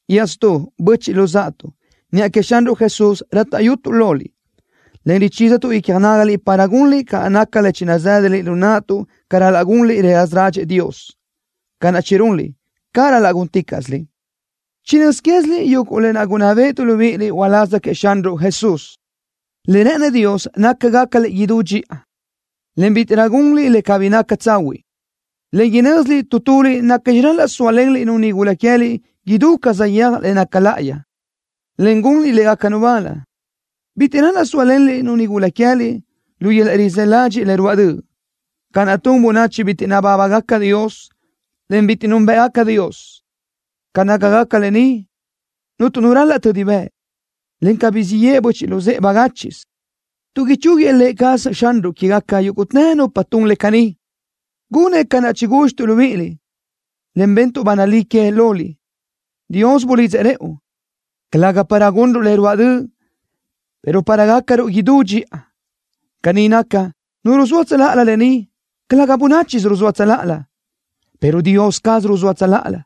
Iaʼstú, böchiʼ luzáʼatuʼ, niʼa queëʼ Xanruʼ Jesús rátaʼyutuʼ loliʼ, en richízatuʼ icja nágaliʼ para gunliʼ ca naca le chinazë́daliʼ lu naʼtuʼ ca ral-laʼ gunliʼ le raza ládxëʼë Dios. Ca naʼ chirunliʼ, caʼ ral-laʼ gúnticaʼsiliʼ. Chinö́z quéziliʼ yuguʼ le gunná béʼetuʼ libíʼiliʼ uláz queëʼ Xanruʼ Jesús. Le rë́ʼënëʼ Dios naca gácaliʼ idú dxiʼa, en bítiʼrö gunliʼ le cabí naca tsahuiʼ, en inö́ziliʼ tu tuliʼ nacxi ral-laʼ sóalenliʼ-nu nigula que queë́liʼ idú ca saʼyéaj le naca láʼayi, en gunliʼ légacanu bal. Bitiʼ ral-laʼ sóalenliʼ-nu nigula queë́liʼ lu yöl-laʼ rizë́ ladxiʼ le ruáʼ döʼ, ca naʼ tun bönachi bitiʼ nabábagaca Dios, en bitiʼ núnbëʼgaca Dios. Ca nácagaca lë ni, cuntu nu ral-laʼ tödi bëʼ, en cabí siʼ yeʼe böchiʼ luzë́ʼe bagáchiʼsö, tuʼ ichúguiëʼ Lë cazëʼ Xanruʼ quégaca yúguʼtë nupa tun le caní, gunëʼ ca naʼ chigúdxituʼ libíʼiliʼ, en bentuʼ ba nalí que loliʼ. Dios bulidzëʼ rëʼu, calëga para gunruʼ le ruáʼ döʼ, pero para gácaruʼ idú dxiʼa. Caní naca, nu ruzóa tsöláʼalö lë ni, calëga bönáchisö ruzóa tsöláʼalö, pero Dios caz ruzóa tsöláʼalö,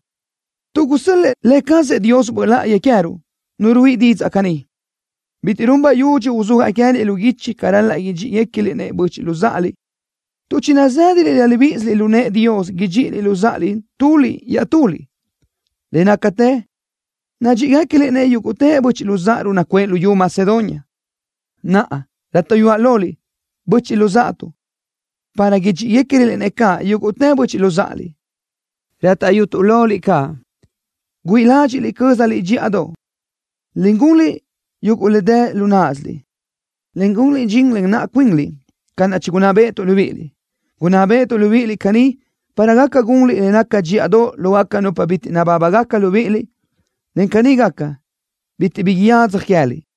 tuʼ gusö́l-lëʼë Lë cazëʼ Dios Böʼ Láʼayi queë́ruʼ, Nu ruíʼi caní didzaʼ. Bitiʼ run bayudxi uzúajaʼ queë́liʼ lu guichi ca ral-laʼ idxíʼigacaliʼ-nëʼ böchiʼ luzáʼaliʼ, tuʼ chinazë́daliʼ laʼ libíʼisiliʼ lu nëʼë Dios idxíʼiliʼ luzáʼaliʼ tuliʼ iaʼtuliʼ. Le nácatë nadxíʼigacaliʼ-nëʼ yúguʼtë böchiʼ luzáʼaruʼ nacuʼë luyú Macedonia. Naʼa, rátaʼyutuʼ loliʼ, böchiʼ luzáʼatuʼ, para idxíʼigacaröliʼ-nëʼ caʼ yúguʼtë böchiʼ luzáʼaliʼ. Rátaʼyutuʼ loliʼ caʼ, güíʼi ládxiʼliʼ cö́zaliʼ dxíʼadoʼ, en gunliʼ yuguʼ le dë lu náʼasiliʼ, en gunliʼ dxin len naʼa cuinliʼ ca naʼ chigunná béʼetuʼ libíʼiliʼ. Gunná béʼetuʼ libíʼiliʼ caní para gaca gunliʼ le naca dxíʼadoʼ lógaca nupa bitiʼ nabábagaca libíʼiliʼ, en caní gaca, bitiʼ bi yadzaj queë́liʼ.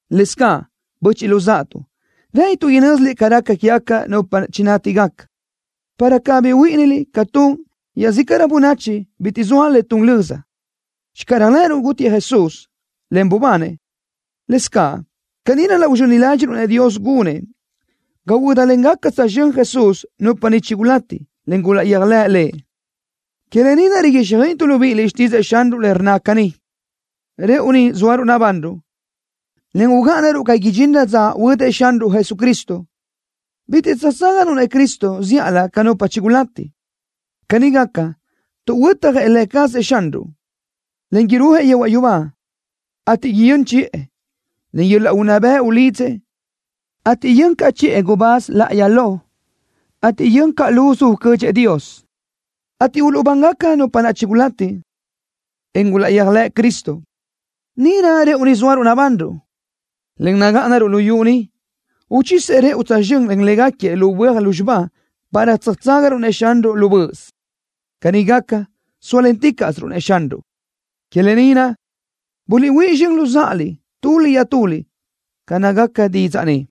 Lëscaʼ, böchiʼ luzáʼatuʼ, rë́ʼënituʼ inö́ziliʼ ca raca quégaca nupa chinátigaca, para cabí huíʼiniliʼ ca tun iaʼzícaʼrö bönachi bitiʼ zoa le tun löza. Channö réajlëʼëruʼ gútiëʼ Jesús, en bubanëʼ, lëscaʼ caní ral-laʼ uzxöni ládxiʼruʼ-nëʼ Dios gunëʼ ga huö́dalengaca tsözxö́n Jesús nupa niʼ chigulati, en gulaʼyéajlëʼ Lëʼ. Que lë ni naʼ riguíxjöiʼituʼ libíʼiliʼ xtídzëʼë Xanruʼ le rnna caní: “Rëʼu ni zóaruʼ nabanruʼ, en ugáʼanaruʼ ga idxinrö dza huödëʼ Xanruʼ Jesucristo, bitiʼ tsöjtságaruʼ-nëʼ Cristo zíʼalö ca nupa chigulati.” Caní gaca, tuʼ huötjëʼ Lë cazëʼ Xanruʼ, en irúajëʼ yehuaʼ yubá, ateʼ yön chiʼë, len yöl-laʼ unná bëʼ ulidzëʼ, ateʼ yön caʼ chiʼë gubáz láʼayi lo, ateʼ yön caʼ luzu ucödxëʼ Dios, ateʼ uluʼbán nupa naʼ chigulati, en gulaʼyéajlëʼ Cristo. Níʼirö rëʼu ni zóaruʼ nabanruʼ, en nagáʼanaruʼ luyú ni, uchisëʼ rëʼu tsözxö́n len léguequi lu böaj lúzxiba para tsöjtságaruʼ-nëʼ Xanruʼ lu böʼös. Caní gaca, sóalenticaʼsiruʼ-nëʼ Xanruʼ. Que lë ni naʼ, guliʼhuíʼ zxön luzáʼaliʼ tuliʼ iaʼtuliʼ ca nácagaca didzaʼ ni.